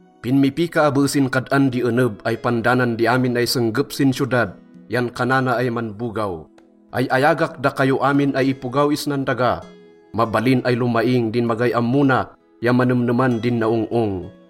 Pinmipika abe sin kad-an di eneb ay pandanan di amin ay senggep sin siyodad yan kanana ay manbogaw, “Ay-ayagak dakayo amin ay ipogaw isnan daga. Mabalin ay lomaing din magay ammo na ya manemneman din naong-ong.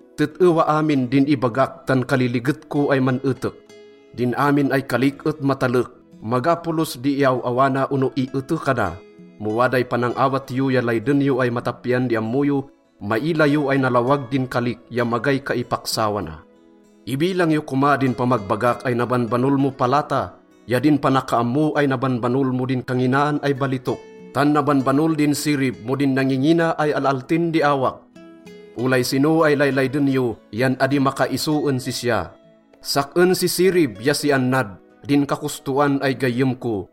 Tet-ewa amin din ibagak tan kaliliget ko ay man-etek. Din amin ay kalik et matalek, maga polos di iaw-awana ono ietekana. Mo waday panang-awat yo ya layden yo ay matapian di ammo yo, maila yo ay nalawag din kalik ya magay kaipaksawana. Ibilang yo koma din pamagbagak ay nabanbanol mo palata ya din panakaammo ay nabanbanol mo din kanginaan ay balitok. Tan nabanbanol din sirib mo din nangingina ay al-altin di awak. Olay sino ay laylayden yo yan adi makaiso en sisya. “Sak-en si Sirib ya si Annad din kakostoan ay gayyem ko.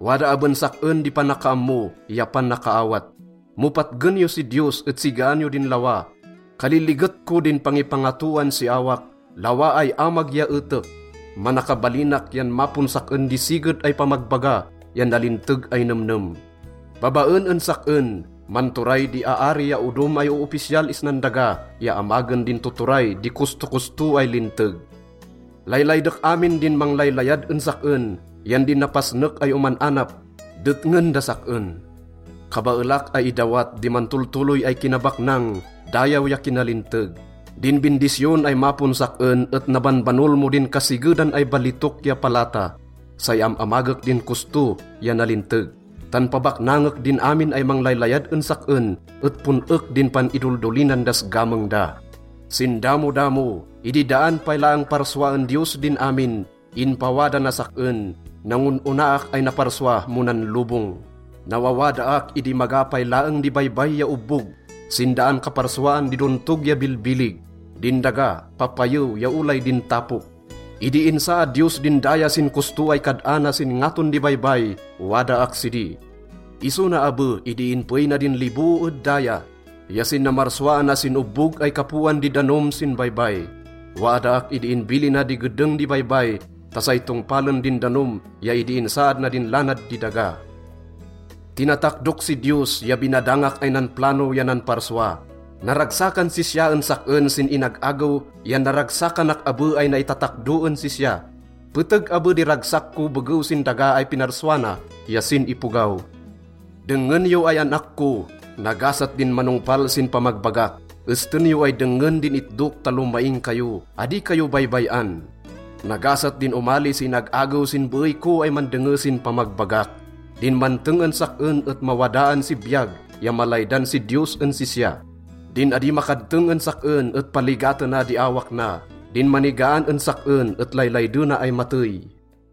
Wada aben sak-en di panakaammo ya panakaawat. Mo patgen yo si Diyos et sigaan yo din lawa. Kaliliget ko din pangipangatoan si awak, lawa ay amag ya etek. Manakabalinak yan mapon sak-en di siged ay pamagbaga ya nalinteg ay nemnem. Babaen en sak-en, manturay di aari ya odom ay oopisyal isnan daga ya amagen din tuturay di kostokosto ay linteg. “Laylaydek amin din manglaylayad en sak-en, yan din napasnek ay oman-anap, detngen das sak-en. Kabaelak ay idawat di mantoltoloy ay kinabaknang, dayaw ya kinalinteg. Din bindisyon ay mapon sak-en et nabanbanol mo din kasigedan ay balitok ya palata. Say am-amagek din kosto ya nalinteg, tan pabaknangek din amin ay manglaylayad en sak-en et pon-ek din pan-idoldolinan das gameng da. “Sin damodamo, idi daan pay laeng parsuaen Diyos din amin, inpawada nas sak-en. Nangon-onaak ay naparsua mo nan lobong. Nawawadaak idi maga pay laeng di baybay ya obbog, sin daan kaparsuaan di dontog ya bilbilig, din daga, papayew ya olay din tapok. Idi insaad Diyos din daya sin kosto ay kad-ana sin ngaton di baybay, wadaak sidi. Iso na abe idi inpeey na din liboo ed daya ya sin namarsuaana sin obbog ay kapoan di danom sin baybay. Wadaak idi inbilina di gedeng di baybay ta say tongpalen din danom ya idi insaad na din lanad di daga. Tinatakdok si Diyos ya binadangak ay nanplano ya nanparsua. Naragsakan sisya en sak-en sin inag-agew yan naragsakanak abe ay naitatakdo en sisya. Peteg abe di ragsak ko begew sin daga ay pinarsua na ya sin ipogaw. “Dengngen yo ay an-ak ko. Nagasat din manongpal sin pamagbagak. Esten yo ay dengngen din itdok ta lomaing kayo. Adi kayo baybay-an. Nagasat din omali si inag-agew sin beey ko ay mandenge sin pamagbagak. Din manteng en sak-en et mawadaan si biyag ya malaydan si Diyos en sisya. Din adi makadteng en sak-en et paligatena di awak na. Din manigaan en sak-en et laylaydena ay matey.”